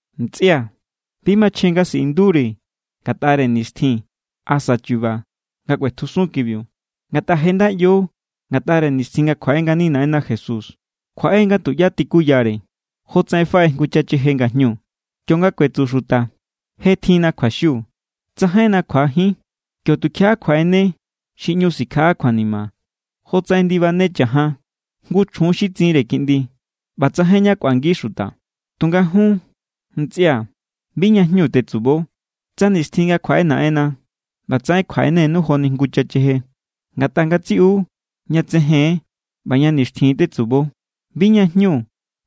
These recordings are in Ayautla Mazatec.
Ntsꞌia̱, bi machjen nga siꞌinduri̱ ngatꞌare nixtjin asa chu̱ba̱ nga kꞌuetjusun kibiu. Ngatꞌa je nda ꞌyo ngatꞌare nixtjin nga kjuaꞌe ngani Naꞌenna Jesús. Kjuaꞌe= nga tuꞌyá tikuyare, jotsaꞌen faꞌe jngu chacheje ngajñu. Kionga kuetsu xuta: “Je tjinna kjuaxiu, tsajainna kjuajín”, kio= tukjiaꞌa kjuaꞌene xi ꞌñu sikjaꞌa kjuanima, jotsaꞌen ndibane cha̱jan jngu chjun xi tsinre kiꞌndi. ꞌBa tsajain ñá kꞌuangi xuta. Tunga jun, ntsꞌia̱, bi ña jñu tetsubo, tsa nixtjin nga kjuaꞌe Naꞌenna ꞌbatsaꞌen kjuaꞌenenu joni jngu chacheje. Ngatꞌa ngatsiꞌu ña tsejen= ꞌba ña nixtjin tetsubo. Bi ña jñu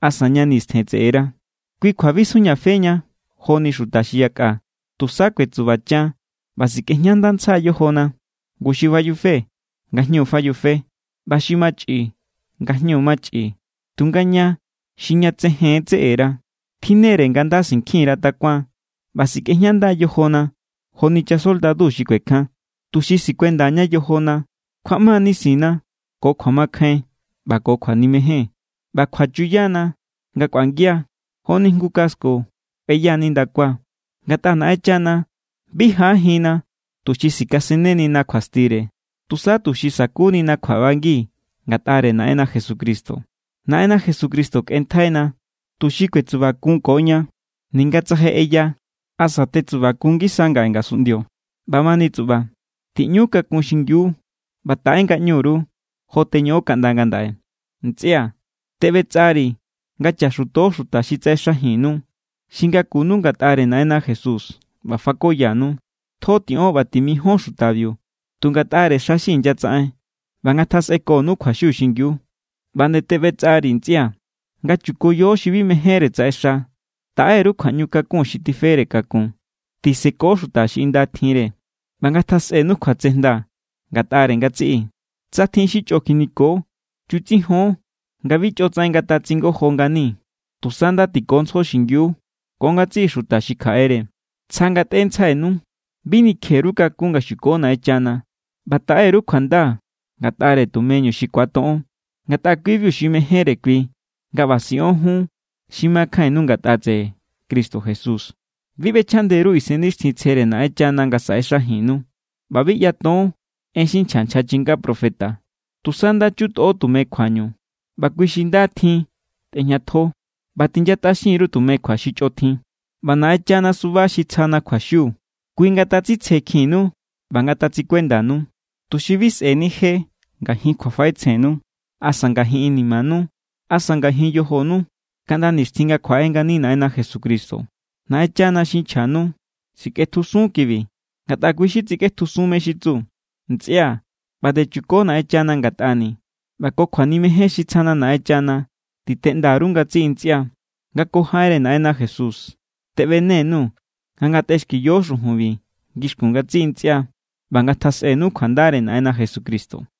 asa ña nistjen tseꞌera. Kui kjua bi sjujñafeña joni xuta xi yakꞌa. Tusa kuetsubachan ꞌba sikꞌejñandantsja yojona. Ngu xi fayufe, ngajñu fayufe. ꞌBa xi machꞌi, ngajñu machꞌi. Tunga ña xi ña tsejen tseꞌera, tjinne=re nga nda sinkjin_ra takuan ꞌba sikꞌejñanda yojona joni chasoldadu xi kuekjan. Tuxi sikuendaña yojona kjuaꞌma nisinna ko kjuamakjain ꞌba ko kjuanimejen, ꞌba kjuachuyana nga kꞌuangia joni jngu casco kꞌueya nindakua. Ngatꞌa Naꞌenchana bi jaꞌajinna tuxi sikasennenina kjuastire, tusa tuxi sa̱kunina kjuaꞌbangi ngatꞌare Naꞌenna Jesucristo. Naꞌenna Jesucristo kꞌenntjaina tuxi kuetsubakunkoña, ninga tsa je ꞌeya asa tetsubakun ngisa ngaꞌe ngasunꞌndio. ꞌBamani tsuꞌba, tiꞌñu kakun xingiu ꞌba taꞌe ngaꞌñu_ru, jo teñoꞌon kaꞌnda ngandaꞌe. Ntsꞌia̱, teꞌbetsꞌari̱ nga chaxuto xuta xi tsaꞌexajinnu, xi ngakunu ngatꞌare Naꞌenna Jesús ꞌba fakoyanu. Tjo tiꞌon ꞌba timijon xutabiu tu ngatꞌare xa xi inyatsaꞌen. ꞌBa ngatjasꞌekonu kjuaxiu xingiu. ꞌBa nde teꞌbetsꞌari̱, ntsꞌia̱, nga chukoyo xi bi mejénre tsaꞌexa. Taꞌe_ru kjuaꞌñu kakun xi tifere kakun. Tiseko xuta xi inda tjinre. ꞌBa ngatjasꞌenu kjuatsejnda ngatꞌare ngatsiꞌi. Tsa tjin xi chꞌo kjiniko, chutsijon nga bi chꞌotsaꞌen ngatatsingojo ngani. Tusa nda tikontsjo xingiu ko ngatsiꞌi xuta xi kjaꞌere. Tsja ngatꞌentsjainu. Bi nikje_ru kakún nga xuko Naꞌenchana. ꞌBa taꞌe_ru kjuanda ngatꞌare tumeñu xi ku̱atoꞌon, ngatꞌa kui=biu xi mejénre kui nga ꞌba siꞌon jun xi makjainnu ngatꞌa tseꞌe Cristo Jesús. Bi ꞌbechjaꞌnde_ru Isennixtjintsjere Naꞌenchana nga saꞌexajinnu. ꞌBa bi ꞌyaton en xi nchja nchja chinga profeta. Tusa nda= chutꞌo tume kjuañu, ꞌba kui xi nda tjin tꞌejñatjo. ꞌBa tinyatꞌaxin_ru tume kjua xi chꞌo tjin. ꞌBa Naꞌenchana suba xi tsjana kjuaxiu, kui ngatatsitsjekjinnu ꞌba ngatatsikuendanu, tuxi bi sꞌe̱ni je ngajin kjuafaꞌetsjennu asa ngajin inimanu asa ngajin yojonu kaꞌnda nixtjin nga kjuaꞌe ngani Naꞌenna Jesucristo. Naꞌenchana xi nchjanu sikꞌetjusun= kibi, ngatꞌa kui= xi tsikꞌetjusunntsjai mé= xi tsu. Ntsꞌia̱, ꞌba nde chuko Naꞌenchana ngatꞌani̱. ꞌBa ko kjuanimejen xi tsjana Naꞌenchana titeꞌnda_ru ngatsiꞌi ntsꞌia. Nga ko jaꞌenre Naꞌenna Jesús teꞌbene_nuu̱ nga ngatꞌexkiyo xujunbi ngixkun ngatsiꞌi ntsꞌia. ꞌBa ngatjasꞌenu kjuandare Naꞌenna Jesucristo.